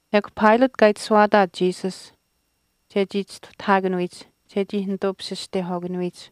Ekw Pilate kaa itashuwaataat Jesus chechii chistuhtahaakanuyich chechii nituu pishishtehwaakanuyich.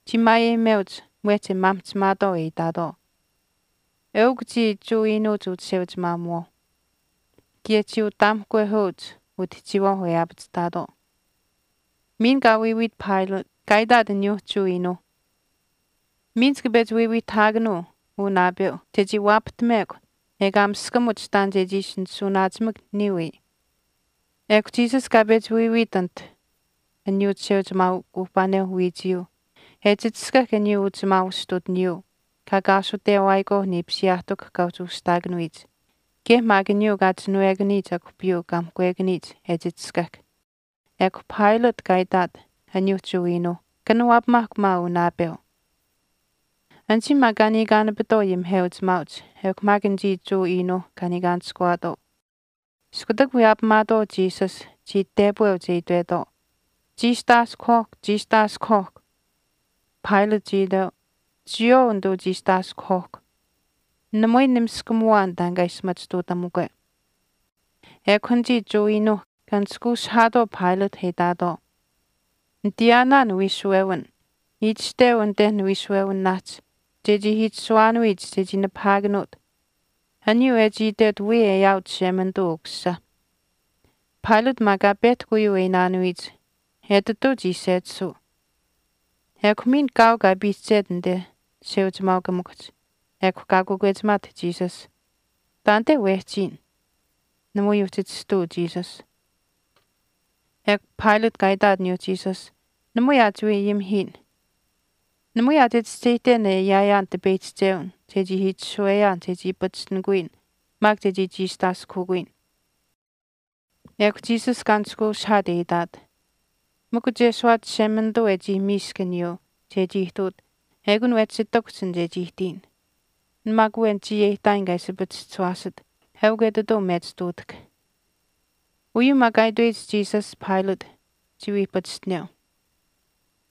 Chii maayeyimeuch mwehch e maamihchimaatwaau e itaatwaau, “Eukw chiya Jewa iinuuch uchisheuchimaamuwaauh.” Kaye chii utaamihkwehweuch utihchiiwaau e aapachihtaatwaau. Miin kaa wiiwiit Pilate kaa itaat aniyuu Jewa iinuuh, “Miin chika pechi wiiwiihtahaakanuu uu naapeu chechii waapahtamekw ekaa miskamuch taan chechii ishi nishuuwanaachimak niya wii.” Ekw Jesus kaa pechi wiiwiit anit aniyuu chisheuchimaaukuuhpaaneu wiichiyuu e chichishkahk aniyuu uchimaau astutiniyuu kaa kaasutewaayikwaau niipisiyaahtikuhch kaa uhchi ushihtaakanuyich kaye maak aniyuu kaa chinwekaniyich akuhpiyuu kaa mihkwekaniyich e chichishkahk. Ekw Pilate kaa itaat aniyuuh Jewa iinuuh, “Kanawaapamaahkw maa uu naapeu.” Anichii maak kaa niikaanapitwaau ayimiheuchimaauch ekw maak anichii Jewa iinuuh kaa niikaanishkuwaatwaau iskutak wiyaapamaatwaau Jesus, chii tepweuch e itwetwaau, “Chiistaaskuhwaahkw, chiistaaskuhwaahkw.” Pilate chii iteu, “Chiyawaau nituu chiistaaskuhwaahkw. Namui nimiskamuwaan taan kaa ishi machituutamukwe.” Ekw anichii Jewa iinuuch kaa nishkweushihaatwaau Pilate e itaatwaau, “Nitayaanaan wiishuwewin, itashteu anit niwiishuwewinaahch chechii itashuwaanuyich chechii nipahaakanuut aniyuu e chii itwet wiya e aawit Chishemanituuh Ukusisa.” Pilate maak kaa pehtahk uyuu e iinaanuyich, etituu chii sechisuu. Ekw miin kaau kaa piihchet anite chisheuchimaaukamikuhch ekw kaa kakwechimaat Jesus, “Taanite wehchiyin.” Namui uhchi chistuu Jesus. Ekw Pilate kaa itaat aniyuu Jesus, “Namui aa chiwii ayimihiyin. Namui aa chichischeyihten e ayaayaan tipeyihchichewin chechii itashuweyaan chechii pachishtinikuyin maak chechii chiistaaskuhukuyin.” Ekw Jesus kaa nishkweushihaat e itaat, “Mikw chesuwaat Chishemanituu e chii miisk aniyuu chechii ihtuut eukun wehchi ihtakuhch an chechii ihtiyin. An maak awen chiya e ihtaayin kaa ishi pachischisuwaasit eukw etituu mechi ihtuutahk.” Uyuu maak kaa itweyich Jesus Pilate, chii wii pachishteneu.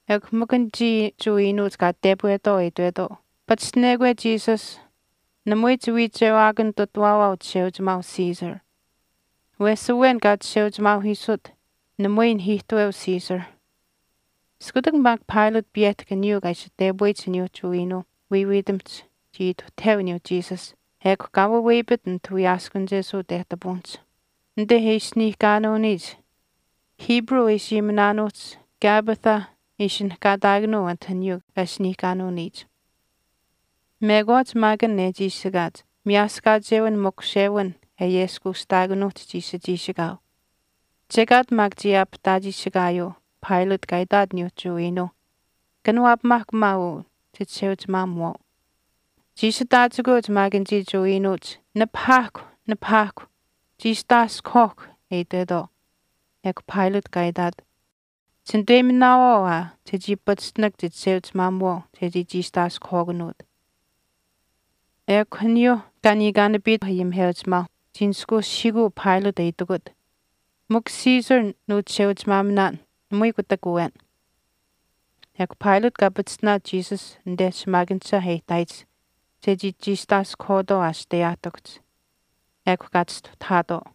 Ekw mikw anichii Jewa iinuuch kaa tepwetwaau e itwetwaau, “Paachishtinekwe Jesus namui chiwiichewaakanitutawaawaau chisheuchimaau siisar. Wesh awen kaa chisheuchimaauhiisut namui nahiihtaweu Caesar.” Iskutak maak Pilate piyehtahk aniyuu kaa ishi tepuweyich aniyuu Jewa iinuuh wiiyawiitimihch chii ituhtaheu aniyuu Jesus ekw kaa waweyapit anit wiyaaskunichesuu tehtapuwinihch, anite e asiniihkaanuuniyich e chii asteyich. Hebrew e ishi ayiminaanuuhch Gabbatha ishinihkaataakanuu anit aniyuu kaa asiniihkaanuuniyich. Mekwaach maak an e chiishikaach miyaaskachewin makushewin e ayeskuushtaakanuuhch chiishi chiishikaau. Chekaat maak chii aapihtaachiishikaayuu Pilate kaa itaat aniyuu Jewa iinuuh, “Kanawaapamaahkw maak uu chichisheuchimaamuwaau.” Chii ishi taachikweuch maak anichii Jewa iinuuch, “Nipahaahkw, nipahaahkw, chiistaaskuhwaahkw,” e itwetwaau. Ekw Pilate kaa itaat, “Chinituweyiminaawaau aa chechii pachishtinak chichisheuchimaamuwaau chechii chiistaaskuhwaakanuut.” Ekw aniyuuh kaa niikaanapitwaau ayimiheuchimaauh chii nishkweushihiikuu Pilate e itikut, “Mikw Caesar nuuchisheuchimaaminaan namui kutak awen.” Ekw Pilate kaa pachishtinaat Jesus anite aniyuu shimaakanisha e ihtaayich chechii chiistaaskuhwaatwaau aashiteyaahtikuhch. Ekw kaa chistuhtahaatwaau.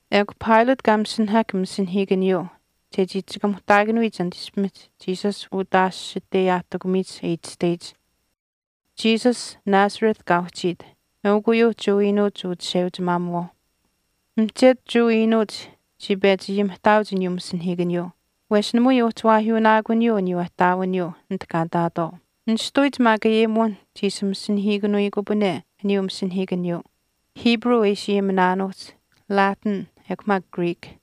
Ekw Pilate kaa masinahahk masinahiikaniyuu chechii chikamuhtaakanuyich anit ishpimihch Jesus utaashiteyaahtikumiihch e itashteyich, “Jesus Nazareth kaa uhchiit eukw uyuu Jewa iinuuch uchisheuchimaamuwaau.” Mihchetu Jewa iinuuch chii pechi ayimihtaauch aniyuu masinahiikaniyuu wesh namui uhchi waahyuunaakuniyuu aniyuu ihtaawiniyuu anit kaa ihtaatwaau. Nishtuyich maak ayimuwinh chii ishi masinahiikanuyikupane aniyuu masinahiikaniyuu Hebrew e ishi ayiminaanuuhch, Latin ekw maak Greek.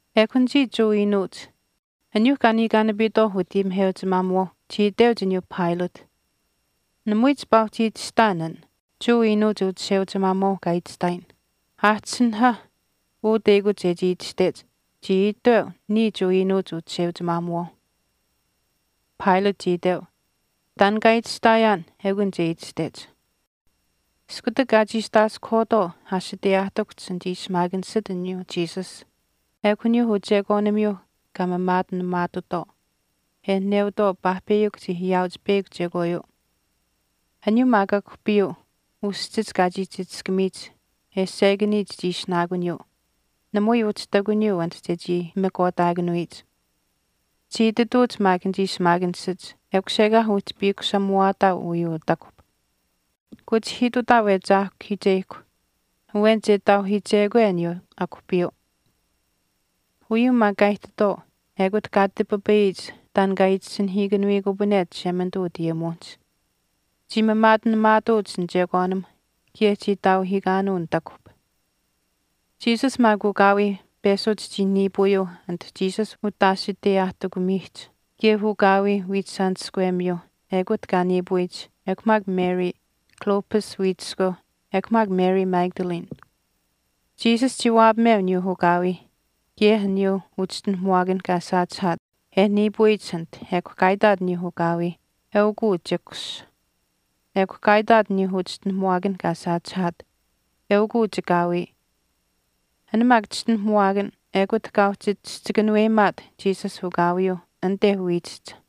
Ekw anichii Jewa iinuuch aniyuuh kaa niikaanapitwaau utayimiheuchimaamuwaauh chii iteuch aniyuu Pilate, “Namui chipaa uhchi itashtaan an Jewa Uchisheuchimaamuwaau kaa itashtaayin.” Aahchisinahah an teyakuch chechii itashtech, “Chii iteu, Niya Jewa iinuuch uchisheuchimaamuwaau.” Pilate chii iteu, “Taan kaa itashtaayaan ekun che itashtech.” Iskutak kaa chiistaaskuhwaatwaau aashiteyaahtikuhch anichii shimaakanishach aniyuu Jesus ekw aniyuu uchekwaanimiyuu kaa maamaatinamaatutwaau e neutwaau paahpeyakw chii ayaauch peyakw chekwaayuu. Aniyuu maak akuhpiyuu uschich kaa chii chichishkamiyich e seyekaniyich chii ishinaakuniyuu namui uhchi ihtakuniyuu anit chechii pimikwaataakanuyich. Chii itituuch maak anichii shimaakanishach, “Ekush ekaa uhchi piikushamuwaataau uyuu utakuhp. Kuchishihiitutaau e chaahkahiicheyihkw awen che taauhiichekwe aniyuu akuhpiyuu.” Uyuu maak kaa ihtitwaau ekut kaa tipipayiyich taan kaa itasinahiikanuyikupane Chishemanituu utayimuwinihch, Chii maamaatinamaatuuch nichekwaanimh kaye chii taauhiikaanuu nitakuhp. Jesus maak ukaawii peshuch chii niipuuyuu anit Jesus utaashiteyaahtikumiihch kaye ukaawii wiichishaaniskwemiyuu ekut kaa niipuyich ekw maak Mary, Clopas wiichiskweu ekw maak Mary Magdalene. Jesus chii waapameu aniyuu ukaawii kaye aniyuu uchischinuhamuwaakan kaa saachihaat e niipuyich anit ekw kaa itaat aniyuu ukaawii, “Eukuu chikus.” Ekw kaa itaat aniyuu uchischinuhamuwaakan kaa saachihaat, “Eukuu chikaawii.” An maak chischinuhamuwaakan ekut kaa uhchi chihchi kanuweyimaat Jesus ukaawiyuu anite wiichihch.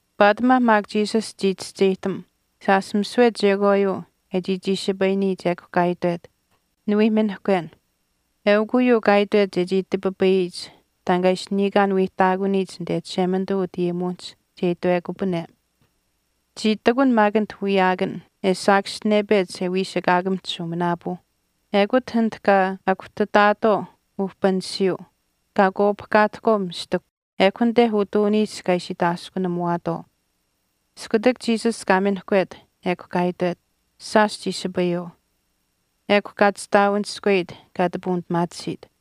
Paatimaa maak Jesus chii chischeyihtam shaash misiwe chekwaayuu e chii chiishipayiniyich ekw kaa itwet, “Niwii minihkwen.” Eukw uyuu kaa itwet chechii tipipayiyich taan kaa ishi niikaan wiihtaakuniyich anite Chishemanituu utayimuwinihch che itwekupane. Chii ihtakun maak anit wiyaakan e saakaschinepech e wiisakaakamihch shuuminaapuu, ekut anit kaa akuhtataatwaau uhpanishiyuu kaa akwaapahkaatahkwaau mistikuhch ekw anite utuuniihch kaa ishi itaaskunamuwaatwaau. Iskutak Jesus kaa minihkwet ekw kaa itwet, “Shaash chiishipayuu.” Ekw kaa chistaawaniskweyit kaa ati puunipimaatisiit.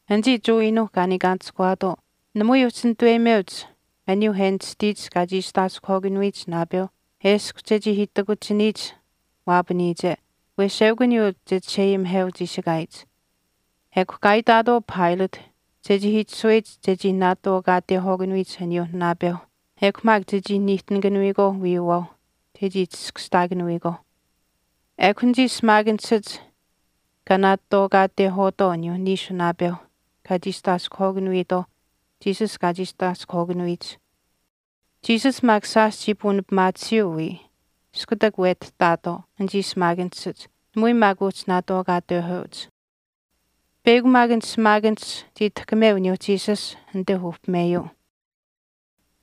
Anichii Jewa iinuuh kaa niikaanishkuwaatwaau namui uhchi nituweyimeuch aniyuuh e nishtiyich kaa chiistaaskuhwaakanuyich naapeu eshkw chechii itakuchiniyich waapaniyiche wesh eukw aniyuu che chisheayimiheu chiishikaayich, ekw kaa itaatwaau Pilate chechii itashuweyich chechii naatwaakaatehwaakanuyich aniyuuh naapeuh, ekw maak chechii niihtinikaanuyikwaau wiiyuwaauh chechii chiskashtaakanuyikwaauh. Ekw anichii shimaakanishach kaa naatwaakaatehwaatwaau aniyuu niishu naapeuh kaa chiistaaskuhwaakanuyitwaau Jesus kaa chiistaaskuhwaakanuyich. Jesus maak shaash chii puunipimaatisiyuu wiya iskutak wetihtaatwaau anichii shimaakanishach namui maak uhchi naatwaakaatehweuch. Peyakw maak an shimaakanish chii tahkameu aniyuu Jesus anite uhpimeyuu.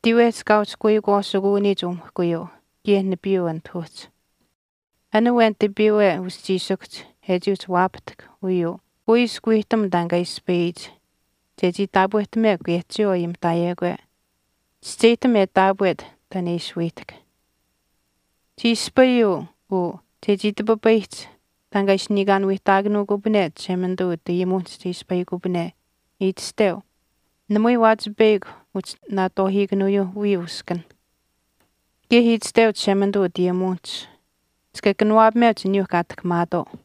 Tiiwehch kaa uhchi kuikwaasikuuniyich umihkuyuu kaye nipiiyuu anit uhchi. An awen tipiiwe uschiishikuhch e chii uhchi waapahtahk uyuu kuiskw wiihtam taan kaa ispayiyich chechii taapwehtamekw kaye chiyawaau ayimihtaayekwe. Chischeyihtam e taapwet taan e ishi wiihtahk. Chii ispayuu uu chechii tipipayihch taan kaa ishi niikaan wiihtaakanuukupane Chishemanituu utayimuwinihch che ispayikupane, itashteu, Namui waachipeyakw uhchi naatwaahiikanuuyuu wiya uskanh. Kaye itashteu Chishemanituu utayimuwinihch, Chika kanawaapameuch aniyuu kaa tahkamaatwaau.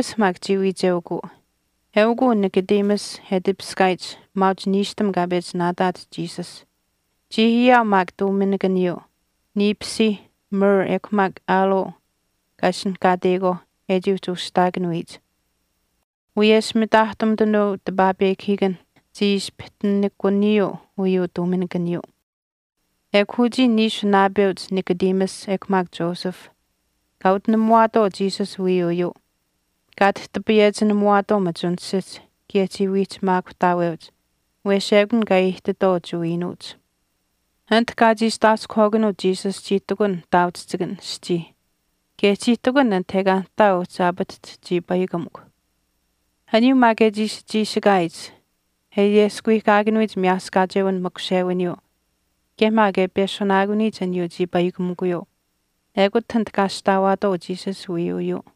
Nicodemus maak chii wiicheukuu. Eukuu Nicodemus e tipiskaayich maauch niishtam kaa pechi naataat Jesus. Chii ayaau maak tuuminikaniyuu niipisiih myrrh ekw maak aloe kaa ishinihkaateyikwaauh e chii uhchi ushihtaakanuyich. Wiyesh mitaahtumitanuu tipaapekahiikan chii ispihtinikuniyuu uyuu tuuminikaniyuu. Ekw uchii niishu naapeuch Nicodemus ekw maak Joseph kaa utinamuwaatwaau Jesus wiiyuuyuu kaa tihtipayechinamuwaatwaau machunishihch kaye chii wiihchimaakutaaweuch wesh ekun kaa chii ihtitwaau Jewa iinuuch. Anit kaa chiistaaskuhwaakanuut Jesus chii ihtakun nihtaauchihchikan aschii kaye chii ihtakun anit ekaa nihtaa uhchi aapatahch chiipaikamikw. Aniyuu maak e chii ishi chiishikaayich, e ayeskuwiihkaakanuyich miyaaskaacheu makushewiniyuu, kaye maak e peshunaakuniyich aniyuu chiipaikamikuyuu, ekute anite kaa ashtaawaatwaau Jesus wiiyuuyuu.